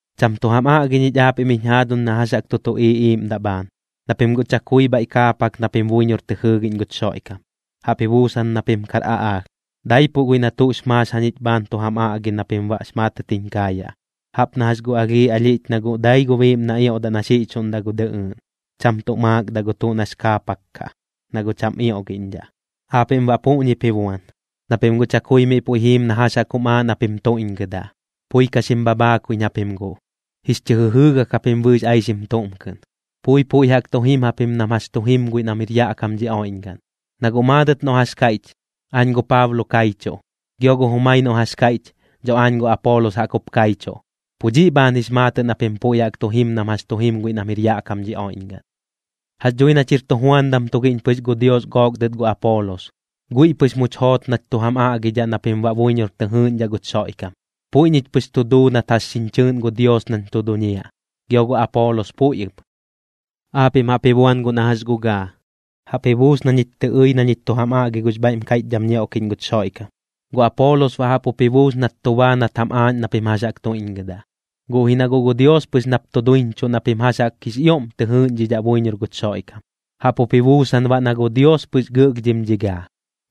Cham tu jam aꞌgi ñich aapiꞌm jiñ jaaduñ na jax jaꞌk tu tuꞌiiꞌ iiꞌmdaꞌ bhaan, na pim guꞌ chakui bhaiꞌ kaapak na pim buiñor tɨ jɨɨgiꞌñ guch Xoiꞌkam, jaꞌp ji buusan na pim kar aꞌaalh. Daipuꞌ guiꞌ na tuꞌx maax jañich bhaan tu jam aꞌgi na pim baꞌx maatɨt jiñ kaayaꞌ, jaꞌp na jax gu alhii ɨlhiꞌch na guꞌ dai gu biiꞌm na ioꞌdaꞌ na xiꞌchuꞌndaꞌ gu dɨꞌɨɨꞌn, cham tuꞌ maakdaꞌ gu tuꞌ nax kaapak kaꞌ, na guꞌ cham ioꞌgiꞌñdhaꞌ. Aapiꞌm baꞌ puꞌñip ji buan, na pim guꞌ chakui miꞌ puiꞌ jiim na jax jaꞌk jum aaꞌ na pim tuiꞌñgɨdaꞌ. Pui ka xim bhabhaakuiꞌñ japim guꞌ, jix chɨ jɨjɨɨgak japim bɨɨx aixim tuꞌm kɨꞌn. Pui puiꞌ jaꞌk tu jim japim nam jax chu jim guiꞌ nam jir yaꞌ kam dhi oiꞌñgaꞌn. Na guꞌ maadɨt noꞌ jax kaiꞌch: “Aañ gu Paablo kaichuꞌ”, gio gu jumai noꞌ jax kaiꞌch: “Dho aañ gu Apoolos jaꞌk jup kaichuꞌ”, pu dhiꞌ bhaan jix maatɨꞌ na pim puiꞌ jaꞌk tu jim nam jax tu jim guiꞌ nam jir yaꞌ kam dhi oiꞌñgaꞌn. Jax dhui nach jir tujuandam tugiꞌñ pɨx gu Dios gook dɨt gu Apoolos, guiꞌ pɨx much joot nach tu jam aꞌgidhaꞌ na pim baꞌ buiñor tɨ jɨɨꞌñdhaꞌ guch Xoiꞌkam. Puiꞌ ñich pɨx tu duu nat jax xiñ chɨɨꞌn gu Dios nañ tu duñiaꞌ, gio gu Apoolos puiꞌ ɨp. Aapiꞌm jaꞌp ji buan guꞌ na jax gu gaa, jaꞌp ji buus na ñich tɨ ɨi na ñich tu jam aꞌgi gux bhaiꞌm kaiꞌchdham ñioꞌkiꞌñ guch Xoiꞌkam, gu Apoolos baꞌ jaꞌp jup ji buus nat tu baa nat jam aaꞌñ na pim jax jaꞌk tuiꞌñgɨdaꞌ. Guꞌ ji na guꞌ gu Dios pɨx nap tu duiñchuꞌ na pim jax jaꞌk jix ioꞌm tɨ jɨɨꞌñdhidhaꞌ buiñor guch Xoiꞌkam, jaꞌp jup ji buusan baꞌ na gu Dios pɨx gɨꞌlhdhim dhi gaa.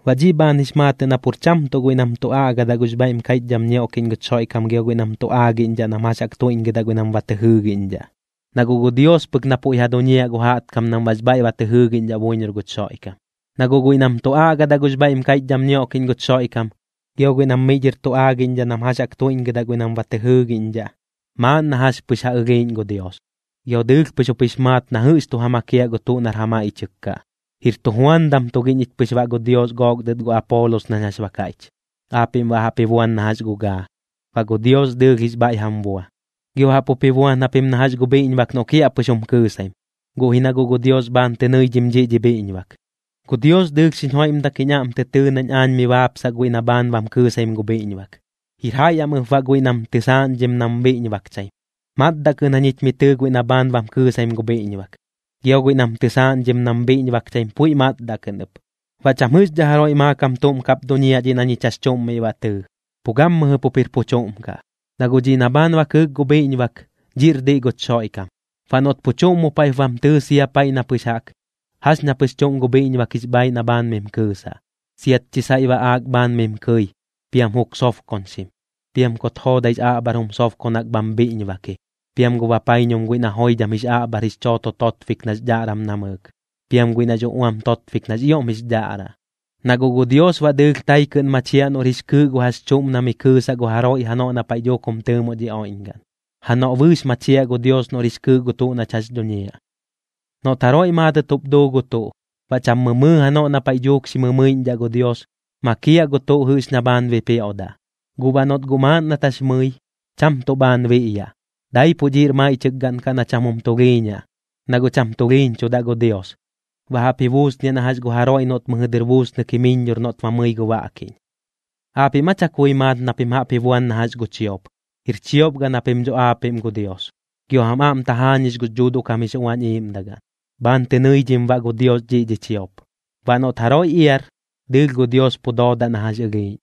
Baꞌ dhiꞌ bhaan jix maatɨꞌ nam pur cham tuꞌ guiꞌ nam tu aꞌgadaꞌ gux bhaiꞌm kaiꞌchdham ñioꞌkiꞌñ guch Xoiꞌkam gio guiꞌ nam tu aagiꞌñdhaꞌ nam jax jaꞌk tuiꞌñgɨdaꞌ guiꞌ nam ba tɨ jɨɨgiꞌñdhaꞌ, na guꞌ gu Dios pɨk na puiꞌ ja duñiaꞌ gu jaꞌtkam nam baꞌx bhaiꞌ ba tɨ jɨɨgiꞌñdhaꞌ buiñor guch Xoiꞌkam. Na guꞌ guiꞌ nam tu aꞌgadaꞌ gux bhaiꞌm kaiꞌchdham ñioꞌkiꞌñ guch Xoiꞌkam gio guiꞌ nam miꞌ dhɨr tu aagiꞌñdhaꞌ nam jax jaꞌk tuiꞌñgɨdaꞌ guiꞌ nam ba tɨ jɨɨgiꞌñdhaꞌ, maaꞌn na jax pɨx ja ɨlhiiꞌñ gu Dios, gio dɨɨlh pɨx jup jix maat na jɨꞌx tu ja makiaꞌ gu tuꞌ nar ja maiꞌchɨk kaꞌ. Jir tujuandam tugiꞌñ ich pɨx baꞌ gu Dios gook dɨt gu Apoolos nañ jax ba kaiꞌch, aapiꞌm baꞌ jaꞌp jup ji buan na jax gu gaa, baꞌ gu Dios dɨɨlh jix bhaiꞌ jam bua. Gio jaꞌp jup ji buan japim na jax gu bhiꞌñbak noꞌ kiaꞌpɨx jum kɨɨsaim, guꞌ ji na guꞌ gu Dios bhaan tɨ nɨiꞌñ dhiꞌ dhi bhiꞌñbak. Gu Dios dɨɨlh xiñ joiꞌmdak jiñ aꞌm tɨ tɨɨ nañ aañ mi baapsaꞌ guiꞌ na bhaan bam kɨɨsaim gu bhiꞌñbak, jir jaiꞌ am ɨp baꞌ guiꞌ nam tɨsaaꞌñdhim nam bhiꞌñbakchaim. Matdaꞌ kɨꞌn jañich mi tɨɨ guiꞌ na bhaan bam kɨɨsaim gu bhiꞌñbak, gio guiꞌ nam tɨsaaꞌñdhim nam bhiꞌñbakchaim puiꞌ matdaꞌ kɨꞌn ɨp. Baꞌ cham jɨꞌxdhaꞌ jaroiꞌ maakam tuꞌm kap duñiaꞌ dhiꞌ na ñich jax chuꞌm miꞌ ba tɨɨ, pu gammɨjɨ pup jir pu chuꞌm kaꞌ, na guꞌ dhiꞌ na bhaan ba kɨɨk gu bhiꞌñbak, dhiꞌr diꞌ guch Xoiꞌkam. Baꞌ noꞌt pu chuꞌm mu paiꞌp bam tɨɨ sia paiꞌ na pɨx jaꞌk, jax ña pɨx chuꞌm gu bhiꞌñbak jix bhaaiꞌ na bhaan mim kɨɨsaꞌ. Siat chi saiꞌ baꞌaak bhaan mim kɨi, piam juk sobkoñxim, piam kut joodaix aꞌbhar jum sobkonak bham bhiꞌñbaki, piam gu bapaiñum guiꞌ na joidham jix aꞌbhar jix chooto totbik nax dhaꞌram namɨɨk, piam guiꞌ nax uꞌuam totbik nax ioꞌm jix dhaꞌraꞌ. Na guꞌ gu Dios baꞌ dɨɨlh tai kɨꞌn machiaꞌ noꞌr jix kɨɨꞌ gu jax chuꞌm na mi kɨɨsaꞌ gu jaroiꞌ janoꞌ na paiꞌ dhuuk jum tɨɨmoꞌ dhi oiꞌñgaꞌn, janoꞌ bɨɨx machiaꞌ gu Dios noꞌr jix kɨɨꞌ gu tuꞌ nach jax dhuñiaꞌ. Noꞌt jaroiꞌ maadɨt jup duu gu tuꞌ, baꞌ cham mɨmɨɨ janoꞌ na paiꞌ dhuuk xi mɨmɨiꞌñdhaꞌ gu Dios, makiaꞌ gu tuꞌ jɨꞌx na bhaan bipioꞌdaꞌ. Guꞌ baꞌ noꞌt guꞌ maaꞌn nat jax mɨi, cham tuꞌ bhaan biꞌyaꞌ, daipuꞌ dhiꞌr maiꞌchɨk gaꞌn kaꞌ na cham jum tulhiiñaꞌ, na guꞌ cham tulhiiñchudaꞌ gu Dios. Baꞌ jaꞌp ji buusniaꞌ na jax gu jaroiꞌ noꞌt mɨjɨ dɨr buusnɨk jimɨiññor noꞌt ba mɨi gu baꞌkiꞌñ. ¿Aapiꞌm aa chakui maat na pim jaꞌp ji buan na jax gu chiop? Jir chiop gaꞌn japim dho aapiꞌm gu Dios, gio jam aꞌm tajaañix gux Dhuuduꞌ kam jix Uañ Iiꞌmdagaꞌn. Bhaan tɨ nɨidhim baꞌ gu Dios dhiꞌ dhi chiop. Baꞌ noꞌt jaroiꞌ iar, dɨɨlh gu Dios pu doodaꞌ na jax ɨlhiiꞌñ.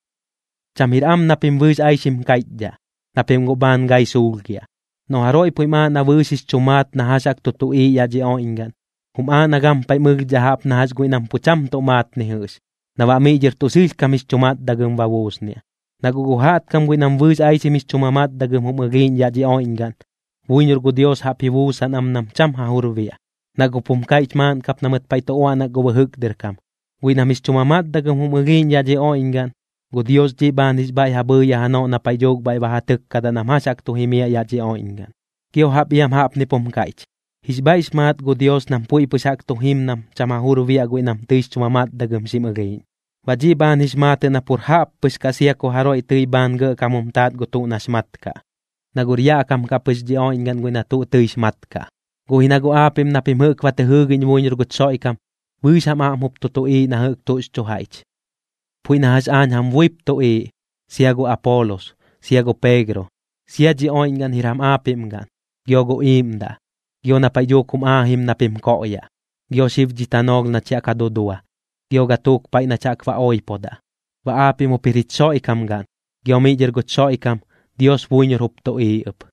Cham jir am na pim bɨɨx aixim kaiꞌchdhaꞌ, na pim guꞌ bhaan gai suulhgiaꞌ. Noꞌ jaroiꞌ puiꞌm aaꞌ na bɨɨx jix chu maat na jax jaꞌk tu tuꞌiiꞌ yaꞌ dhi oiꞌñgaꞌn, jum aaꞌ na gampaiꞌm ɨlhdhaꞌ jaꞌp na jax guiꞌ nam pu cham tuꞌ maat ni jɨꞌx, na baꞌ miꞌ dhɨr tuꞌ sɨlhkam jix chu matdagɨm ba buusniaꞌ. Na guꞌ gu jaꞌtkam guiꞌ nam bɨɨx aixim jix chu mamatdagɨm jum ɨlhiiꞌñ yaꞌ dhi oiꞌñgaꞌn, buiñor gu Dios jaꞌp ji buusan am nam cham ja jur biaꞌ, na guꞌp jum kaiꞌch maaꞌn kap na mɨt paiꞌ tu uaꞌnak gu bɨjɨk dɨr kam: “Guiꞌ nam jix chu mamatdagɨm jum ɨlhiiꞌñ yaꞌ dhi oiꞌñgaꞌn, gu Dios dhiꞌ bhaan jix bhaiꞌ ja bhɨɨyaꞌ janoꞌ na paiꞌ dhuuk bhaiꞌ ba ja tɨkkadaꞌ nam jax jaꞌk tu jimiaꞌ yaꞌ dhi oiꞌñgaꞌn.” Gio jaꞌp iam jaꞌpnip jum kaiꞌch: “Jix bhaiꞌx maat gu Dios nam puiꞌ pɨx jaꞌk tu jim nam cham ja jur biaꞌ guiꞌ nam tɨix chu mamatdagɨm xim ɨlhiiꞌñ.” Baꞌ dhiꞌ bhaan jix maatɨꞌ na pur jaꞌppɨx kaꞌ sia ku jaroiꞌ tɨi bhaan gɇꞌkam jum taat gu tuꞌ nax mat kaꞌ, na guꞌr yaꞌ kam kaꞌ pɨx dhi oiꞌñgaꞌn guiꞌ na tuꞌ tɨix mat kaꞌ. Guꞌ ji na guꞌ aapiꞌm na pim jɨꞌk ba tɨ jɨɨgiꞌñ buiñor guch Xoiꞌkam, bɨɨx jam aꞌm jup tu tuꞌiiꞌ na jɨꞌk tuꞌx chu jaiꞌch. Puiꞌ na jax aañ jam buip tuꞌiiꞌ, sia gu Apoolos, sia gu Peegro. Sia dhi oiꞌñgaꞌn jir jam aapiꞌm gaꞌn, gio gu iiꞌmdaꞌ, gio na paiꞌ dhuuk jum aajim na pim koꞌyaꞌ, gio xib dhi tanoolh nach ya ka dudua, gio gatuuk paiꞌ nach jaꞌk ba oipodaꞌ. Baꞌ aapiꞌm jup jir jich Xoiꞌkam gaꞌn, gio miꞌ dhɨr guch Xoiꞌkam, Dios buiñor jup tuꞌiiꞌ ɨp.